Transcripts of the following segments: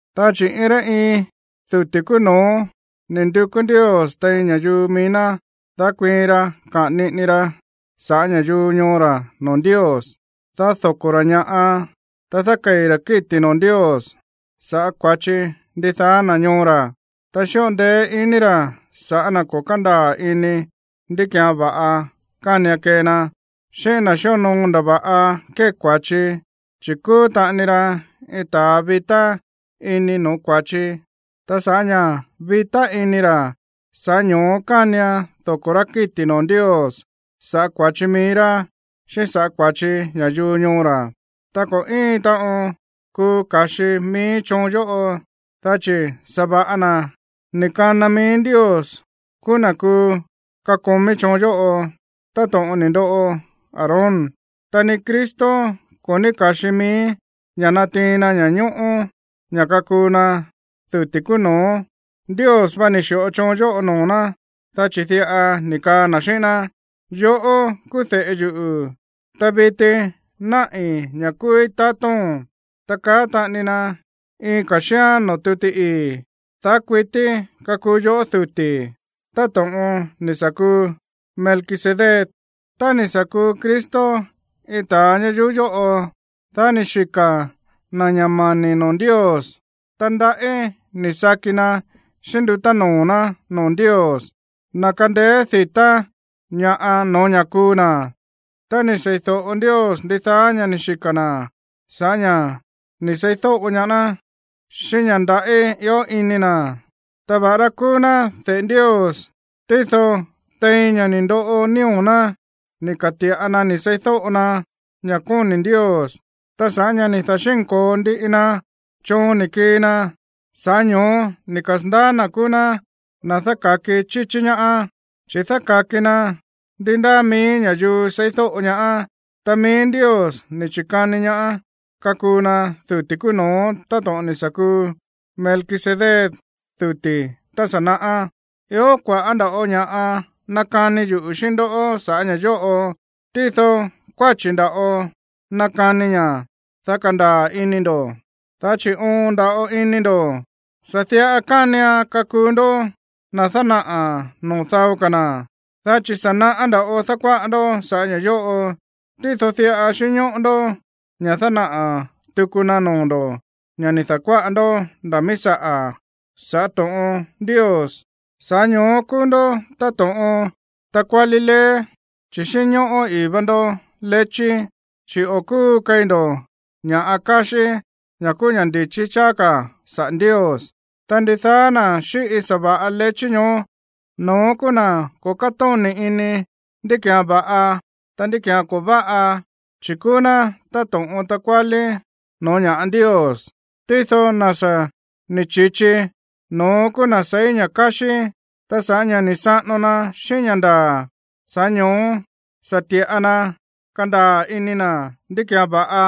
Dá chi̱ iin rá iin duti̱ kúú no̱ó ni̱ ndukú Ndios tein ña̱yuu mií ná, dá kuiin ra kaꞌa̱n niꞌini ra sa̱ꞌá ña̱yuu ñoo ra̱ noo̱ Ndios, dá doko̱ rá ña̱ꞌa, ta dákei̱ ra̱ kíti̱ noo̱ Ndios sa̱ꞌá kua̱chi ndidaá na̱ ñoo ra̱. Ta xíꞌo ndeé iní ra̱ sa̱ꞌá na̱ ko̱ kándaa̱ ini ndí ki̱án va̱ꞌa kánian kee na, xíꞌín na̱ xíonoo ndava̱ꞌa kée kua̱chi, chi̱ kúú taꞌani ra iin ta̱a vitá ini no̱ó kua̱chi. Ta sa̱ꞌá ña̱ vitá ini ra̱, sa̱ꞌá ño̱ó kánian doko̱ rá kíti̱ noo̱ Ndios sa̱ꞌá kua̱chi mií rá, xíꞌín sa̱ꞌá kua̱chi ña̱yuu ñoo ra̱. Ta ko̱ íin taꞌon kuu ka̱xi mií choon yóꞌo, dá chi̱ sa̱va̱ꞌa na̱ ni̱ kana mií Ndios kúú na̱ kuu kakomí choon yóꞌo, táto̱ꞌon ni̱ ndoꞌo Aarón. Ta ni Cristo ko̱ ní ka̱xi mií ña̱ natiin na ña̱ñóꞌó ña̱ kakuu na duti̱ kúú no̱ó. Ndios vá ni̱ xi̱ꞌo choon yóꞌo noo̱ ná, dá chi̱ diꞌa ni̱ kaa na̱ xíꞌín ná: Yoꞌó kúú de̱ꞌe yuꞌu̱, ta viti náꞌi̱ ña̱ kúúí tatóo̱n. Ta kaá taꞌani na iin ka̱ xíán noo̱ tuti ii̱: Daá kuití kakuu yoꞌó duti̱, táto̱ꞌon ni̱ sa̱ kuu Melquisedec. Tá ni̱ sa̱ kuu Cristo iin ta̱a ñayuú yóꞌo, dá ni̱ xika̱ na̱ ña̱ mani̱ noo̱ Ndios, ta ndaꞌí ni̱ saki na xíꞌín ndutá noo̱ ná noo̱ Ndios, na̱ kándéé di̱tá ñaá no̱ó ña̱ kuu na̱. Ta ni̱ seídóꞌo Ndios ndidaá ña̱ ni̱ xika̱ na̱ sa̱ꞌá ña̱ ni̱ seídóꞌo ñaá ná xíꞌín ña̱ ndaꞌí ió ini na̱. Ta va̱ꞌará kúú ná de̱ꞌe Ndios, tído tein ña̱ ni̱ ndoꞌo nío̱ ná ni̱ ka̱ti̱ꞌa na ni̱ seídóꞌo na ña̱ kóni̱ Ndios. Ta sa̱ꞌá ña̱ ni̱ da̱xínko̱o ndiꞌi na choon ni̱ kii na, sa̱ꞌá ño̱ó ni̱ kasa̱ndaá na̱ kúú ná na̱ dáka̱ki chíchí ñaá, chi̱ dáka̱ki na ndi ndáa mií ña̱yuu seídóꞌo ñaá. Ta mií Ndios ni̱ chi̱kani ñaá kakuu na duti̱ kúú no̱ó táto̱ꞌon ni̱ sa̱ kuu Melquisedec duti̱ tá sa̱ naꞌá. Ió kua̱ꞌá nda̱ꞌo ña̱ꞌa nakani yuꞌu̱ xíꞌín ndó sa̱ꞌá ña̱ yóꞌo, tído kuáchi̱ nda̱ꞌo nakanii ña̱, dá kandaa̱ ini ndo̱, dá chi̱ oon nda̱ꞌo ini ndo̱. Sa̱ diꞌa kánian kakuu ndó na̱ dánaꞌa̱ noo̱ dao ka̱ na̱, dá chi̱ sa̱ naꞌá nda̱ꞌo dákuáꞌa ndó saꞌa̱ ña̱ yóꞌo. Tído diꞌa xínñóꞌó ndó ña̱ dánaꞌa̱ tuku na noo̱ ndo̱ ña̱ ni̱ da̱kuáꞌa ndó nda̱ míí saꞌa̱ sa̱ꞌá to̱ꞌon Ndios. Sa̱ꞌá ño̱ó kúú ndó táto̱ꞌon takuálí leé, chi̱ xínñóꞌó ii̱ vá ndó lechí, chi̱ o̱ kúu keí ndó ña̱ꞌa káxí, ña̱ kúú ña̱ ndi̱chí cháá ka̱ saꞌa̱ Ndios. Ta ndidaá na̱ xíꞌi sa̱va̱ꞌa lechí ñoó, no̱ón kúú na̱ ko̱ kátóni̱ ini ndí ki̱án va̱ꞌa, ta ndí ki̱án ko̱ váꞌa, chi̱ kúú ná táto̱ꞌon takuálí no̱ó ña̱ꞌa Ndios. Tído na̱ sa̱ ni̱ chi̱chi, no̱ón kúú na̱ seí ña̱ káxí, ta sa̱ꞌá ña̱ ni̱ saꞌano na xíꞌín ña̱ ndaa̱, sa̱ꞌá ño̱ó sa̱ ti̱ꞌa na kandaa̱ ini na̱ ndí ki̱án va̱ꞌa,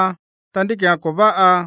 ta ndí ki̱án ko̱ váꞌa.